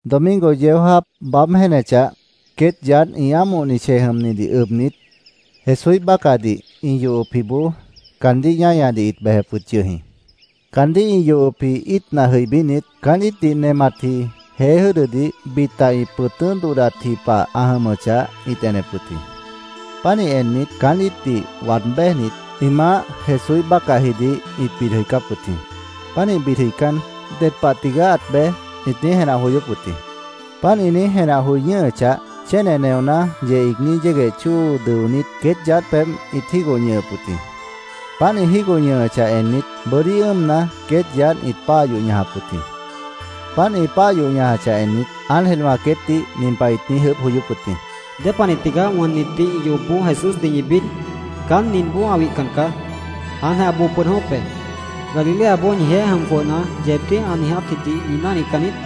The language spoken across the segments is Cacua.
Domingo yeó jáap baáb jéenechah, queét yaádh ĩ ámohni chej jʉmnidih ʉbnit, Jesúíh bácahdih ĩ yohopjiboó caandíh ñáñadih ĩt bejep wʉt yʉh jĩ. Caandíh ĩ yohopji íitna jʉibínit, caán íitdih nematji jeé jʉ́dʉdih bita ĩ pʉ̃tʉ́ dodhdatji pah ã jʉmʉchah, ĩt enep wʉt jĩ. Pánih ennit, caán íitdih waad béjnit, ĩ Maáh Jesúíh bácahjidih ĩt bid jʉicáp wʉt jĩ. Pánih bid jʉicán, “¿Ded pah tigaá ãt bej?” ĩt niíj jenah joyóp wʉt jĩ. Páant ĩ niíj jenah joi ñʉ́hʉchah, chéne neoná yeh iigní yégueh chóo dʉonít, queét yaádh pebh ĩt jígoh ñʉhʉp wʉt jĩ. Páant ĩ jígoh ñʉhʉchah ennit, bʉ́dí ʉ́ʉmna, queét yaádh ĩt páah yoh ñajap wʉt jĩ. Páant ĩ páah yoh ñajachah ennit, ángelwã queétdih nin pah ĩt niíj ʉʉ́bh joyóp wʉt jĩ: —¿Dépanih tigaá wʉnnitdih ĩ yohopboó Jesúsdih ñi bid? Caán ninboó ã wihcan caá. Jáantjeh ã boo pʉd jʉ̃ʉ́wʉ́p be. ¿Galileaboó ñijeéh jʉm jwʉhna, yeebdíh ã niijátjidih ñi náhnican niít?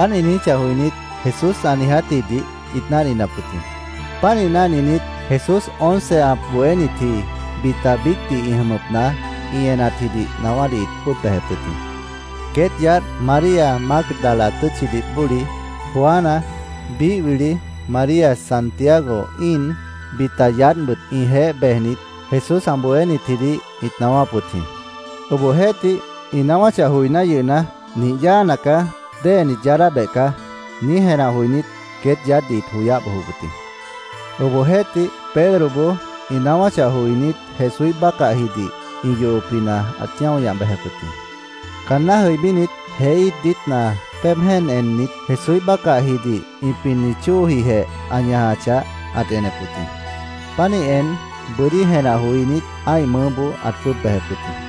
Páant ĩ niijíchah joinít, Jesús ã niijátjidih ĩt náhninap wʉt jĩ. Pánih náhninit, Jesús once ã bohénitji, bita biícdih ĩ jʉmʉpna ĩ enatjidih naáwádih ĩt jwʉ́ʉb bejep wʉt jĩ. Queét yaádh María Mágdala tʉ́tchidih bóli, Juana, biíh wili María Santiago íin, bita yaádhbʉt ĩjeéh bejnit Jesús ã bohénitjidih ĩt naáwáp wʉt jĩ. Obohjeéhtih, ĩ naáwáchah joiná yʉhna, “Nih yáana caá. Déhenit yaadábeh caá”, niíj jenah joinít, queét yaádhdih ĩt joyáh bojop wʉt jĩ. Obohjeéhtih, Pedroboó ĩ naáwáchah joinít, Jesúíh bácahjidih ĩ yohopjina ãt ñáo ñah bejep wʉt jĩ. Caanná jʉibínit, jeé íit diítna péeb jéen ennit, Jesúíh bácahjidih ĩ pinni chóojijeh ã ñajachah, ãt enep wʉt jĩ. Pánih en, bʉ́dí jenah joinít, ã́ih mʉʉ́boó ãt jwʉ́ʉb bejep wʉt jĩ.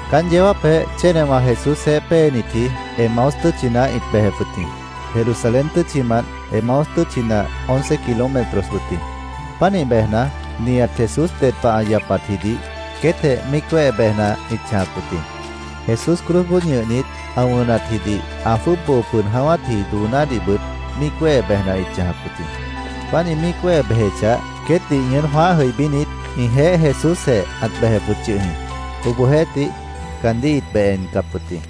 Caán yeó jáapjeh chénewã Jesúsjeéh péenitji Emaús tʉ́tchina ĩt bejep wʉt jĩ. Jerusalén tʉ́tchimant Emaús tʉ́tchina once kilómetros wʉt jĩ. Pánih bejna, nihat Jesús ded pah ã yapatjidih queétjeh míic wéhe bejna ĩt chãjap wʉt jĩ. Jesús cruzboó ñʉhnit, ã wʉnatjidih, ã jwʉ́ʉb boo pʉd jʉ̃ʉ́wátji doonádihbʉt míic wéhe bejna ĩt chãjap wʉt jĩ. Páant ĩ míic wéhe bejechah, queétdih ñʉʉ́n jwãáh jʉibínit, ĩjeéh Jesúsjeh ãt bejep wʉt yʉh jĩ. Obohjeéhtih, caandíh ĩt beh encap wʉt jĩ.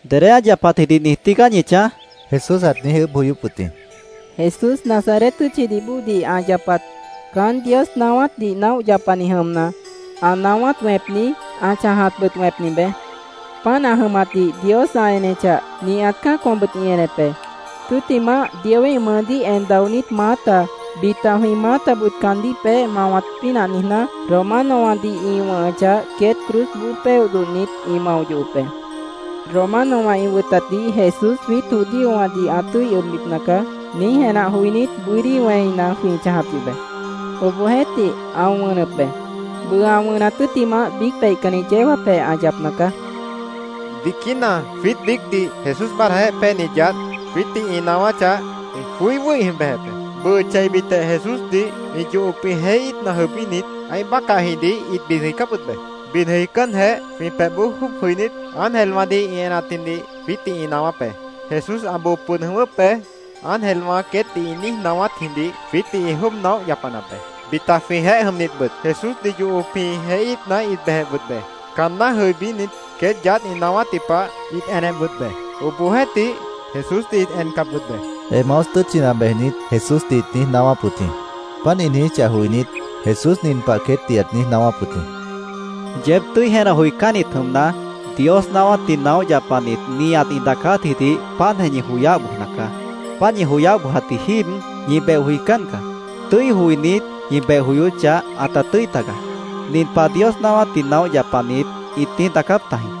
—¿Dedé ã yapatjidih niij tígaá ñi chãj? Jesús ãt niíj ʉʉ́bh joyóp wʉt jĩ. —Jesús, Nazaret tʉ́tchidih bóodih ã yapat. Caán Dios naáwátdih naóh yapani jʉmna, ã naáwát wẽpni, ã chãjatbʉt wẽpni beé. Páant ã jʉmatdih Dios ã enechah, nihat cã́acwãbʉt ĩ enep be. Tʉ́ttimah, Dioíh mʉʉdíh en daonít maáta, bita jwĩ maátabʉt caandíh peéh mawat pínah niijná, Romanowãdih ĩ wʉ̃hʉchah, queét cruzboó péoh dodhnit, ĩ mao yohop be. ‘Romanowã ĩ wʉtatdih Jesús jwiít judíowãdih ã tʉ́i ʉbbipna caá’, niíj jenah joinít, bʉ́dí wẽina jwĩ chãjap yʉh be. Obohjeéhtih, ã wʉnʉp be. Bʉʉ ã wʉnat tʉ́ttimah biíc peihcanni yeó jáapjeh ã yapna caá. Biquína jwiít biícdih Jesús báadhdajeéh péenit yaádh jwiítdih ĩ naáwáchah, jwĩ joí wʉ́hi bejep be. Bʉʉ cheibitjeh Jesúsdih ĩ yohopji jeé íitna jʉibínit, ã́ih bácahjidih ĩt bid jʉicáp wʉt be. Bid jʉicánjeh, jwĩ pebhboó jwʉ́ʉb jʉinít, ángelwãdih ĩ enatjidih jwiítdih ĩ naáwáp be. ‘Jesús ã boo pʉd jʉ̃ʉ́wʉ́p be’, ángelwã queétdih ĩ niíj naáwátjidih jwiítdih ĩ jwʉ́ʉb naóh yapanap be. Bita jwĩjeéh jʉmnitbʉt Jesúsdih yohopji jeé íitna ĩt bejep wʉt be. Caanná jʉibínit, queét yaádh ĩ naáwátji pah ĩt enep wʉt be. Obohjeéhtih, Jesúsdih ĩt encap wʉt be, Emaús tʉ́tchina bejnit Jesúsdih ĩt niíj naáwáp wʉt jĩ. Páant ĩ niijíchah joinít, Jesús nin pah queétdih ãt niíj naáwáp wʉt jĩ: —Yeéb tʉ́i jenah joicánnit jʉmna, Dios naáwátdih naóh yapanit nihat ĩ daacátjidih páantjeh ñi joyáh bojna caá. Páant ñi joyáh bojat jíib, ñi beh joicán caá. Tʉ́i joinít, ñi beh joyóchah, ãta tʉ́i tagaá. Nin pah Dios naáwátdih naóh yapanit ĩt niíj daacáp tajĩ.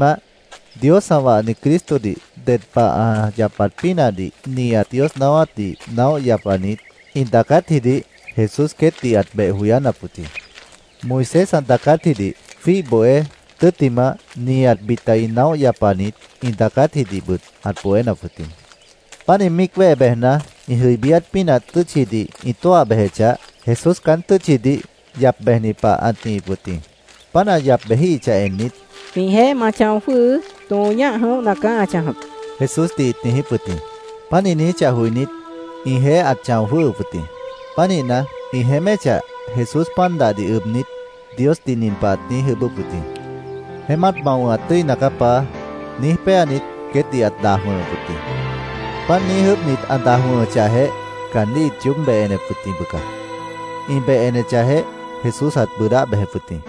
Tʉ́ttimah, Dios ã wahni Cristodih ded pah ã yapat pínahdih nihat Dios naáwátdih naóh yapanit ĩ daacátjidih Jesús queétdih ãt beh joyánap wʉt jĩ. Moisés ã daacátjidih jwíih bohé, tʉ́ttimah nihat bita naóh yapanit ĩ daacátjidihbʉt ãt bohénap wʉt jĩ. Páant ĩ míic wéhe bejna, ĩ jʉibíát pínah tʉ́tchidih ĩ tóah bejechah, Jesús caán tʉ́tchidih yap bejni pah ãt nihip wʉt jĩ. Páant ã yap bejíhichah ennit, “Jwĩjeéh ma chão jwʉ́hʉʉ́. Tõo ñáh jʉ̃óhna caá ã chãjap”, Jesúsdih ĩt niijíp wʉt jĩ. Páant ĩ niijíchah joinít, ĩjeéh ãt chão jwʉ́hʉp wʉt jĩ. Pánihna, ĩ jeéméchah, Jesús pan dahdih ʉbnit, Diosdih nin pah ãt niíj ʉʉ́bʉ́p wʉt jĩ: “Jeémát ma wʉ̃hat tʉ́ina caá, Paá”, niíj péanit, queétdih ãt daj wʉ̃hʉp wʉt jĩ. Páant niíj ʉʉ́bhnit, ã daj wʉ̃hʉchahjeh, caandíh ĩt yoób beh enep wʉt jĩ, bʉca. Ĩ beh enechahjeh, Jesús ãt bʉʉdáh bejep wʉt jĩ.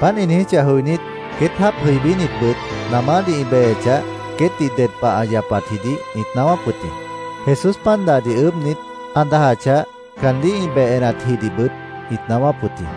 Páant ĩ niijíchah joinít, queét jáap jʉibínitbʉt namádih ĩ bejechah, queétdih ded pah ã yapatjidih ĩt naáwáp wʉt jĩ. Jesús pan dahdih ʉʉ́bhnit, ã dajachah, caandíh ĩ beh enatjidihbʉt ĩt naáwáp wʉt jĩ.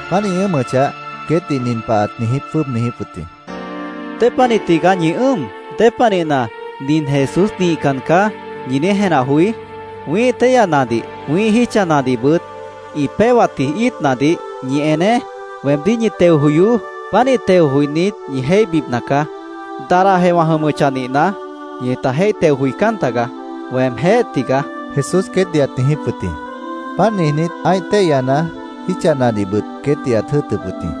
Páant ĩ ʉ́ʉmʉchah, queétdih nin pah ãt jwʉ́ʉb niijíp wʉt jĩ: —¿Dépanih tigaá ñi ʉ́ʉm? ¿Dépanihna ‘Nin Jesús nihcan caá’, ñi niíj jenah joí? Wĩ́ih téihyanadih, wĩ́ih jítchanadihbʉt ĩ péhwatji íitnadih ñi eneé. Weemdíh ñi teo joyoó. Pánih teo joinít, ñi jéihbipna caá. Dadahjeh wã jʉmʉchah nihna, ñita jéih teo joicán tagaá. ¡Weemjéh tigaá! Jesús queétdih ãt niijíp wʉt jĩ. Páant niijnít, ã́ih téihyana, jítchanadihbʉt, queétdih ãt jʉ́ʉtʉp wʉt jĩ.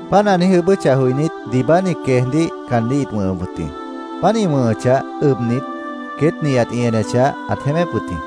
Páant ã niíj ʉʉ́bʉ́chah joinít, diibáni queejdíh caandíh ĩt wʉ̃hʉp wʉt jĩ. Páant ĩ wʉ̃hʉchah ʉbnit, queét nihat ĩ enechah, ãt jeémép wʉt jĩ.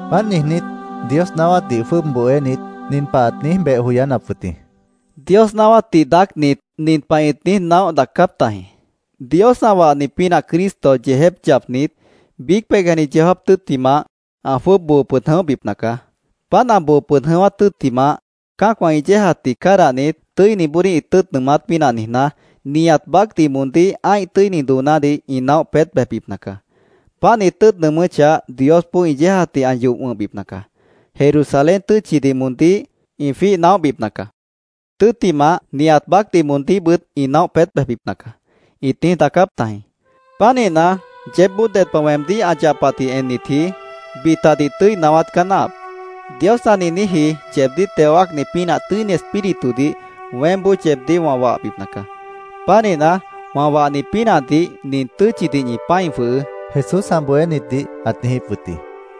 Páant niijnít, Dios naáwátdih jwʉ́ʉb bohénit, nin pah ãt niíj beh joyánap wʉt jĩ: —Dios naáwátdih daácnit nin pah ĩt niíj naóh daacáp tajĩ. ‘Dios ã wahni pínah Cristo yeejép yapnit, biíc peihcanni yeó jáap tʉ́ttimah, ã jwʉ́ʉb boo pʉd jʉ̃óhbipna caá. Páant, ã boo pʉd jʉ̃ʉ́wát tʉ́ttimah, cã́acwã ĩ yéejatdih cádahnit, tʉ́iniboodíh ĩ tʉ́ʉt nʉʉmát pínah niijná, nihat baácdih moondíh ã́ih tʉ́ini doonádih ĩ naóh peét bejbipna caá. Páant ĩ tʉ́ʉt nʉʉmʉ́chah, Diosboó ĩ yéejatdih ã yoh wʉ̃hbipna caá. Jerusalén tʉ́tchidih moondíh ĩ jwíih naóhbipna caá. Tʉ́ttimah, nihat baácdih moondíhbʉt ĩ naóh peét bejbipna caá’, ĩt niíj daacáp tajĩ. Pánihna, yeébboó ded pah weemdíh ã yapatdih ennitji, bitadih tʉ́i naáwát caá náahap. Dios ã niijníji yeebdíh teo wáacni pínah Tʉ́ini Espíritudih weémboó yeebdíh wã wahbipna caá. Pánihna, wã wahni pínahdih nin tʉ́tchidih ñi pã́i jwʉhʉʉ́, Jesús ã bohénitdih ãt niijíp wʉt jĩ.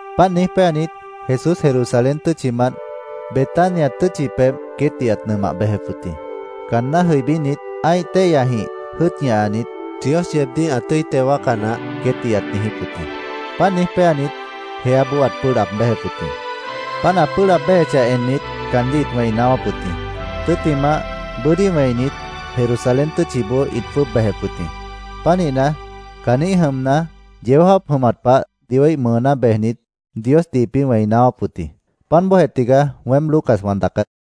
Páant niíj péanit, Jesús Jerusalén tʉ́tchimant Betania tʉ́tchi pebh queétdih ãt nʉmah bejep wʉt jĩ. Caanná jʉibínit, ã́ih téihyajĩh jʉ́ʉt ñahanit, “Dios yeebdíh ã tʉ́i teo wáaca naáh”, queétdih ãt niijíp wʉt jĩ. Páant niíj péanitjeh, jeáboó ãt pʉ́ʉh laab béjep wʉt jĩ. Páant ã pʉ́ʉh laab béjechah ennit, caandíh ĩt wẽi naáwáp wʉt jĩ. Tʉ́ttimah, bʉ́dí wẽinit, Jerusalén tʉ́tchiboó ĩt jwʉ́ʉb bejep wʉt jĩ. Pánihna, caanjĩ́h jʉmna, yeó jáap jʉmat pah Dioíh mʉʉná bejnit, Diosdih ĩpĩ́ wẽi naáwáp wʉt jĩ. Páant bóojeh tigaá weém Lucas wã daacát.